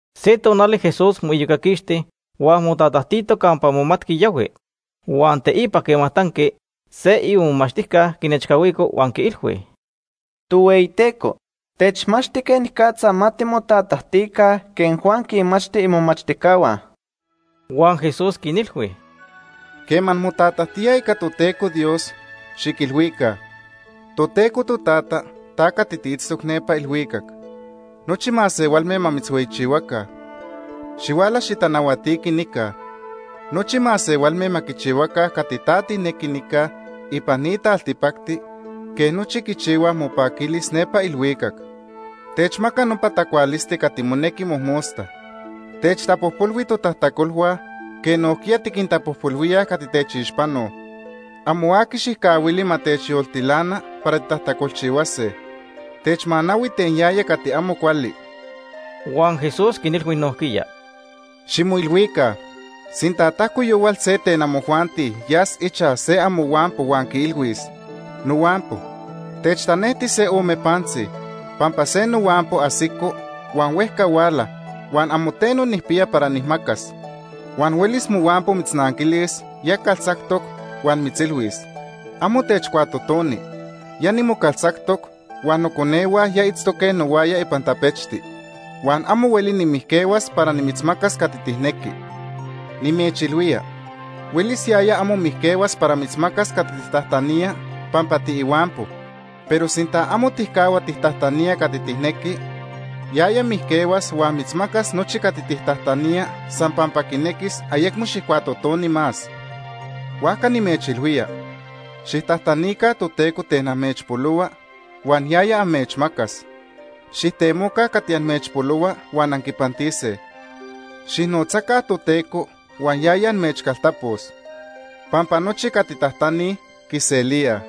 Se tonali Jesús moiyocaquixti huan motatajtito campa momatqui yahui. Huan teipa quema tanqui, se imomachtijca quinechcahuico huan quiilhui: ―Tohueyiteco, techmachti quenicatza ma timotatajtica quej Juan quinmachti imomachtijcahua. Huan Jesús quinilhui: ―Quema anmotatajtíaj ica Toteco Dios, xiquilhuica: Toteco Totata, ta cati tiitztoc nepa ilhuicac. Nochi masehualme ma mitzhueyichihuaca Ma quihueyichihuaca motoca.. Xihuala xitanahuatiqui nica. Nochi masehualme ma quichihuaca cati ta tijnequi nica ipan ni taltipacti, quej nochi quichihuaj mopaquilis nepa ilhuicac. Techmaca nopa tacualisti cati monequi mojmosta. Techtapojpolhui totajtacolhua quej nojquiya tiquintapojpolhuíaj cati techixpanoj. Amo aqui xijcahuili ma techyoltilana para titajtacolchihuase. Techmanahui ten yaya cati amo cuali. Huan Jesús quinilhui nojquiya: ―Ximoilhuica sinta tajco yohual se ten amojuanti yas ichaj se amohuampo huan quiilhuis: ‘Nohuampo, techtanejti se ome pantzi, pampa se nohuampo ajsico huan huejca huala, huan amo teno nijpiya para nijmacas.’ Huan huelis mohuampo mitznanquilis ya caltzactoc huan mitzilhuis: ‘Amo techcuatotoni. Ya nimocaltzactoc, huan noconehua ya itztoque nohuaya ipan tapechti. Huan amo hueli nimijquehuas para nimitzmacas cati tijnequi.’ Nimechilhuía, huelis yaya amo mijquehuas para mitzmacas cati tijtajtanía pampa tiihuampo, pero sinta amo tijcahua tijtajtanía cati tijnequi, yaya mijquehuas huan mitzmacas nochi cati tijtajtanía san pampa quinequis ayecmo xijcuatotoni más. Huajca nimechilhuía, xijtajtanica Toteco ten amechpolohua, huan yaya amechmacas. Xijtemoca cati amechpolohua huan anquipantise. Xijnotzaca Toteco huan yaya amechcaltapos. Pampa nochi cati tajtanij, quiselíaj.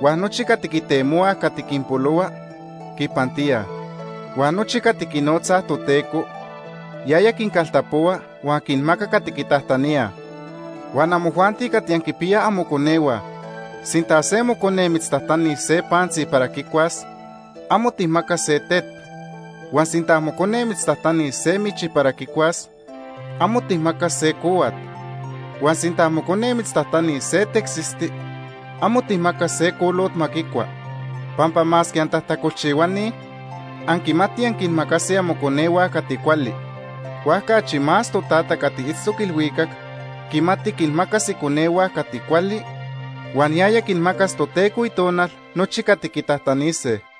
Huan nochi cati quitemohuaj cati quinpolohua, quipantíaj. Huan nochi cati quinotzaj Toteco, yaya quincaltapohua huan quinmaca cati quitajtaníaj. “Huan amojuanti cati anquinpiyaj amoconehua, sinta se mocone mitztajtanis se pantzi para quicuas, amo tijmacas se tet. Huan sinta mocone mitztajtanis se michi para quicuas, amo tijmacas se cohuat. Huan sinta mocone mitztajtanis se tecsisti, amo tijmacas se colot ma quicua. Pampa masque antajtacolchihuani, anquimatij anquinmacase amoconehua cati cuali. Huajca achi más Totata cati itztoc ilhuicac quimati quinmacas iconehua cati cuali, huan yaya quinmacas Toteco Itonal nochi cati quitajtanise.”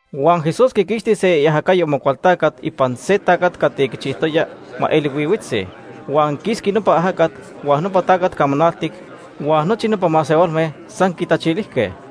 Huan Jesús quiquixti se iajacayo Amocualtacat ipan se tacat cati quichijtoya ma eli nonotzi. Huan quisqui nopa ajacat, huan nopa tacat camanaltic huan nochi nopa masehualme san quitachilijque.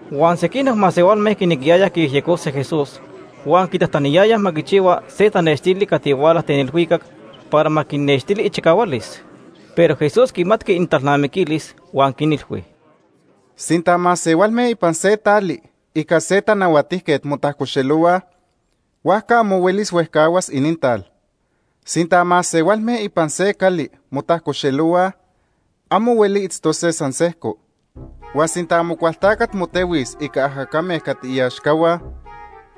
Huan sequinoc masehualme quinequiyayaj quiyejyecose Jesús huan quitajtaniyayaj ma quichihua se tanextili cati huala ten ilhuicac para ma quinnextili ichicahualis. Pero Jesús quimatqui inintalnamiquilis huan quinilhui: “Sinta masehualme ipan se tali ica se tanahuatijquet motajcoxelohuaj, huajca amo hueli huejcahuas inintal. Sinta masehualme ipan se cali motajcoxelohuaj, amo hueli itztose san sejco. Huan sinta Amocualtacat motehuis ica ajacame cati iaxcahua,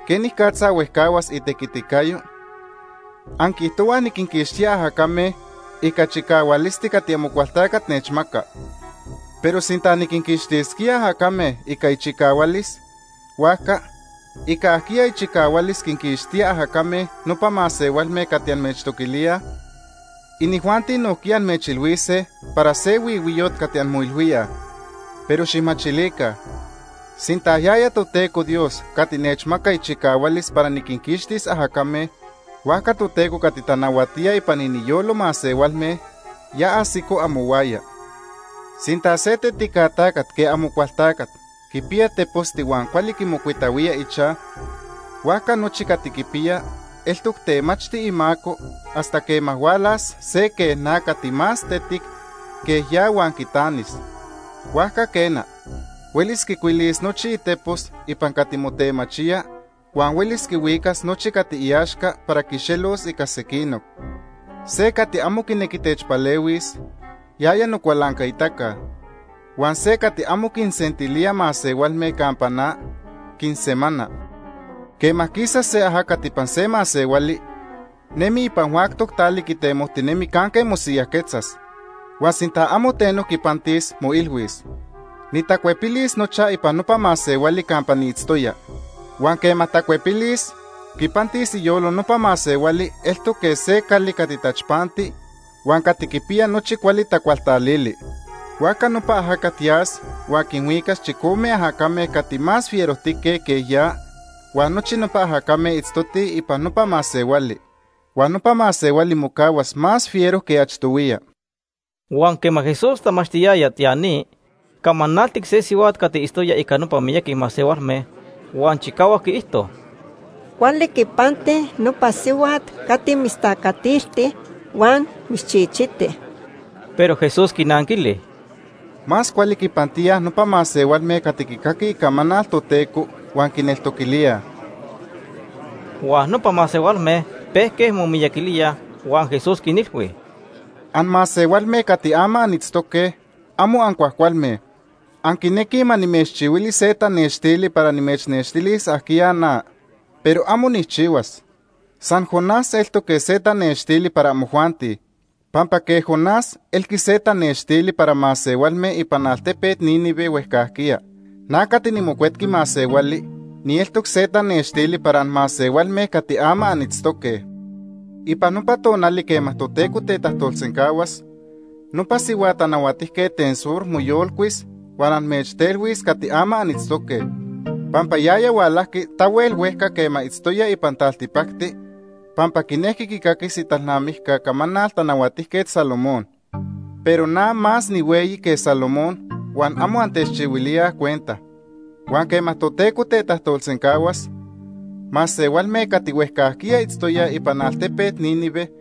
¿quenicatza huejcahuas itequiticayo? Anquiijtohuaj niquinquixtía ajacame ica chicahualisti cati Amocualtacat nechmaca. Pero sinta niquinquixtisquía ajacame ica ichicahualis, huajca ¿ica ajquiya ichicahualis quinquixtíaj ajacame nopa masehualme cati amechtoquilíaj? Inijuanti nojquiya amechilhuise para se huihuiyot cati anmoilhuíaj. Pero xijmachilica, sinta yaya Toteco Dios cati nechmaca ichicahualis para niquinquixtis ajacame, huajca Toteco cati tanahuatía ipan iniyolo masehualme ya ajsico amohuaya. “Sinta se tetica tacat quej Amocualtacat quipiya teposti huan cuali quimocuitahuía ichaj, huajca nochi cati quipiya eltoc temachti imaco, hasta quema hualas se quej na cati más tetic que ya huan quitanis. Huajca quena, huelis quicuilis nochi itepos ipan cati motemachía, huan huelis quihuicas nochi cati iaxca para quixelos ica sequinoc. “Se cati amo quinequi techpalehuis, yaya nocualancaitaca. Huan se cati amo quinsentilía masehualme campa na, quinsemana “Quema quisa se ajacat ipan se masehuali, nemi ipan huactoc tali quitemojtinemi canque mosiyajquetzas, huan sinta amo teno quipantis, moilhuis: ‘Nitacuepilis nochaj ipan nopa masehuali campa niitztoya.’ Huan quema tacuepilis, quipantis iyolo nopa masehuali eltoc quej se cali cati tachpanti huan cati quipiya nochi cuali tacualtalili. Huajca nopa ajacat yas huan quinhuicas chicome ajacame cati más fierojtique que ya huan nochi nopa ajacame itztotij ipan nopa masehuali. Huan nopa masehuali mocahuas más fiero que achtohuiya.” Huan quema Jesús tamachtiyaya ya ni, camanaltic se sihuat cati itztoya ica nopa miyaqui masehualme, huan chicahuac quiijto: ―Cuali quipanti nopa sihuat cati mitztacatilti huan mitzchichiti. Pero Jesús quinanquili: ―Más cuali quipantíaj nopa masehualme cati quicaquij icamanal Toteco huan quineltoquilíaj. Huan nopa masehualme pejque momiyaquilíaj huan Jesús quinilhui: ―Anmasehualme cati ama anitztoque amo ancuajcualme. Anquinequij ma nimechchihuili se tanextili para nimechnextilis ajquiya na. Pero amo nijchihuas. San Jonás eltoc quej se tanextili para amojuanti. Pampa quej Jonás elqui se tanextili para masehualme ipan altepet Nínive huejcajquiya, na cati niMocuetqui Masehuali nieltoc se tanextili para anmasehualme cati ama anitztoque. Ipan nopa tonali quema Toteco tetajtolsencahuas, nopa sihua tanahuatijquet ten Sur Sabá. moyolcuis huan amechtelhuis cati ama anitztoque, pampa yaya hualajqui tahuel huejca quema itztoya ipan taltipacti pampa quinejqui quicaquis italnamijca camanal Tanahuatijquet Salomón. Pero na más nihueyi que Salomón huan amo antechchihuilíaj cuenta. Huan quema Toteco tetajtolsencahuas, masehualme cati huejcajquiya itztoyaj ipan altepet Nínive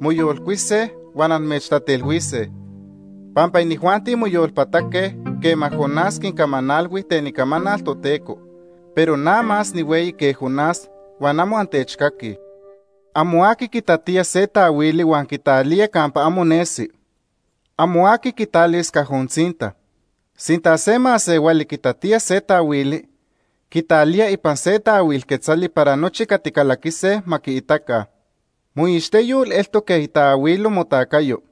moyolcuise huan amechtatelhuise, pampa inijuanti moyolpataque quema Jonás quincamanalhui ten icamanal Toteco, pero na más nihueyi que Jonás huan amo antechcaquij. “Amo aqui quitatía se taahuili huan quitalía campa amo nesi. Amo aqui quitalis cajo tzinta. Sinta se masehuali quitatía se taahuili, quitalía ipan se taahuil quetzali para nochi cati calaquise ma quiitaca. Moixteyol eltoc quej itaahuilo motacayo.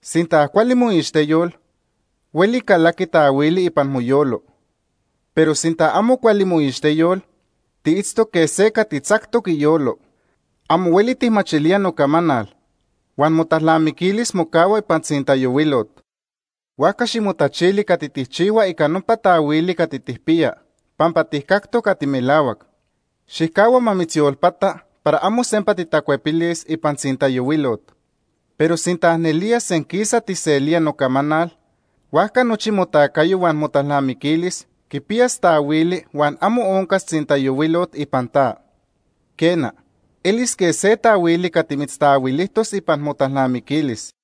Sinta cuali moixteyol, hueli calaqui taahuili ipan moyolo. Pero sinta amo cuali moixteyol, tiitztoc quej se cati tzactoc iyolo. Amo hueli tijmachilía nocamanal huan motalnamiquilis mocahua ipan tzintayohuilot. Huajca ximotachili cati tijchihua ica nopa taahuili cati tijpiya pampa tijcactoc cati melahuac. Xijcahua ma mitzyolpata para amo sempa titacuepilis ipan tzintayohuilot. Pero sinta nelía senquisa tijselía nocamanal, huajca nochi motacayo huan motalnamiquilis quipiyas taahuili huan amo oncas tzintayohuilot ipan ta. Quena, elis quej se taahuili cati mitztaahuilijtos ipan motalnamiquilis.”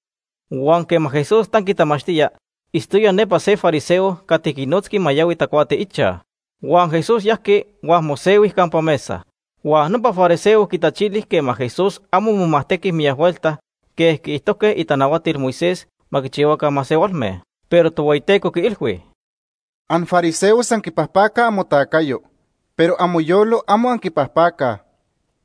Huan quema Jesús tanqui tamachtía, itztoya nepa se fariseo cati quinotzqui ma yahui tacuati ichaj. Huan Jesús yajqui huan mosehui campa mesa. Huan nopa fariseo quitachili quema Jesús amo momajtequi miyac huelta quej quiijtojque itanahuatil Moisés ma quichihuaca masehualme. Pero Tohueyiteco quiilhui: ―Anfariseos anquipajpacaj amotacayo, pero amoyolo amo anquipajpacaj.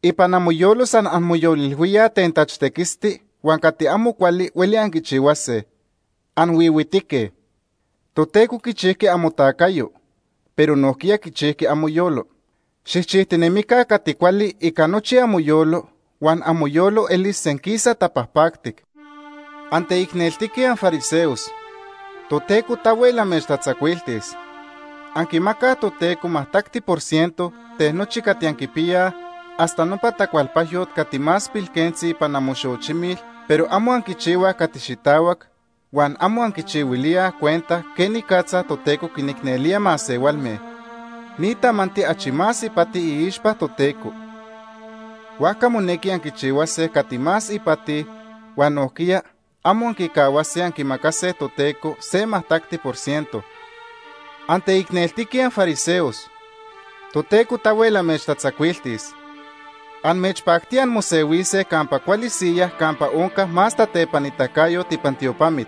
Ipan amoyolo san anmoyolilhuíaj ten tachtequisti huan cati amo cuali hueli anquichihuase. ¡Anhuihuitique! Toteco quichijqui amotacayo, pero nojquiya quichijqui amoyolo. Xijchijtinemica cati cuali ica nochi amoyolo huan amoyolo elis senquisa tapajpactic. “¡Anteicneltique anfariseos! Toteco tahuel amechtatzacuiltis. Anquimacaj Toteco majtacti por ciento ten nochi cati anquipiyaj hasta nopa tacualpajyot cati más pilquentzi ipan amoxochimil, pero amo anquichihuaj cati xitahuac huan amo anquichihuilíaj cuenta quenicatza Toteco quinicnelía masehualme. Ni tamanti achi más ipati iixpa Toteco. Huajca monequi anquichihuase cati más ipati huan nojquiya amo anquicahuase anquimacase Toteco se majtacti por ciento. “¡Anteicneltique anfariseos! Toteco tahuel amechtatzacuiltis. Amechpactía anmosehuise campa cuali siyaj campa onca más tatepanitacayot ipan tiopamit.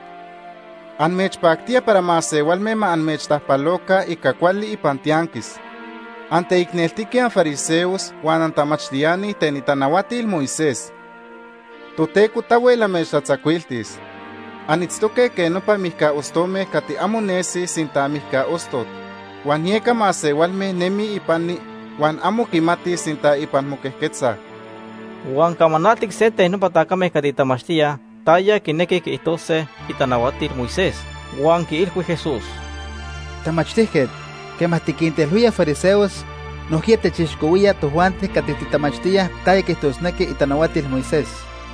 Amechpactía para masehualme ma amechtajpaloca ica cuali ipan tianquis. “¡Anteicneltique anfariseos huan antamachtiani ten itanahuatil Moisés! Toteco tahuel amechtatzacuiltis. Anitztoque quej nopa mijca ostome cati amo nesi sinta mijca ostot huan yeca masehualme nemij ipani huan amo quimatij sinta ipan moquejquetzaj.” Huan camanaltic se ten nopa tacame cati tamachtíaj taya quinequij quiijtose itanahuatil Moisés huan quiilhui Jesús: ―Tamachtijquet, quema tiquintelhuía fariseos, nojquiya techixcohuía tojuanti cati titamachtíaj taya quiijtosnequij itanahuatil Moisés.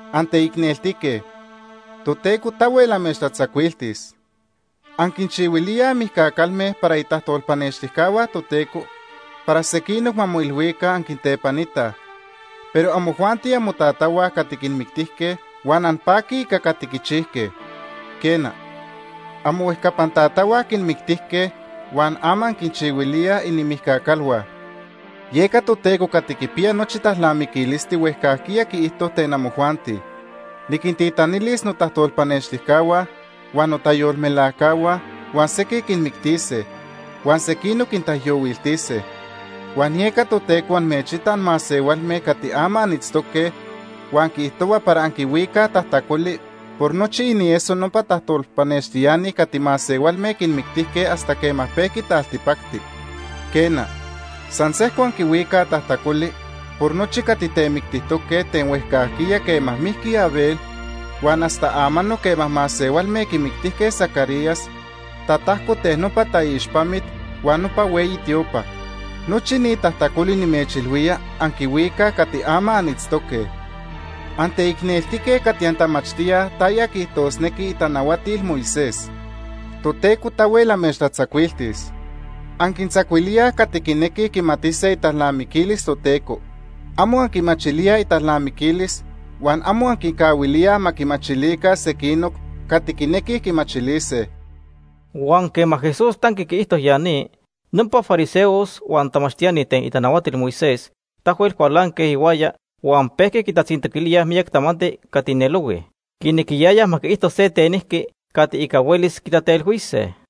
“¡Anteicneltique! Toteco tahuel amechtatzacuiltis. Anquinchihuilíaj mijca calme para itajtolpanextijcahua Toteco para sequinoc ma moilhuica anquintepanitaj, pero amojuanti amotatahua cati quinmictijque, huan anpaquij ica cati quichijque. Quena, amohuejcapan tatahua quinmictijque huan ama anquinchihuilíaj inimijca calhua. “Yeca Toteco cati quipiya nochi talnamiquilisti huejcajquiya quiijto ten amojuanti: ‘Niquintitanilis notajtolpanextijcahua, huan notayolmelajcahua huan sequij quinmictise, huan sequinoc quintaijyohuiltise.’ Huan yeca Toteco amechita anmasehualme cati ama anitztoque huan quiijtohua para anquihuicaj tajtacoli por nochi inieso nopa tajtolpanextiani cati masehualme quinmictijque hasta quema pejqui taltipacti. Quena, san sejco anquihuicaj tajtacoli por nochi cati temictijtoque ten huejcajquiya quema mijqui Abel huan hasta amanoc quema masehualme quimictijque Zacarías tatajco ten nopa taixpamit huan nopa hueyi tiopa. Nochi ni tajtacoli nimechilhuía anquihuicaj cati ama anitztoque. “¡Anteicneltique cati antamachtíaj taya quiijtosnequij itanahuatil Moisés! Toteco tahuel amechtatzacuiltis. Anquintzacuilíaj cati quinequij quimatise italnamiquilis Toteco. Amo anquimachilíaj italnamiquilis huan amo anquincahuilíaj ma quimachilica sequinoc cati quinequij quimachilise.” Huan quema Jesús tanqui quiijto ya ni, nopa fariseos huan tamachtiani ten itanahuatil Moisés tahuel cualanque ihuaya huan pejque quitatzintoquilíaj miyac tamanti cati nelohui. Quinequiyayaj ma quiijto se tenijqui cati ica huelis quitatelhuise.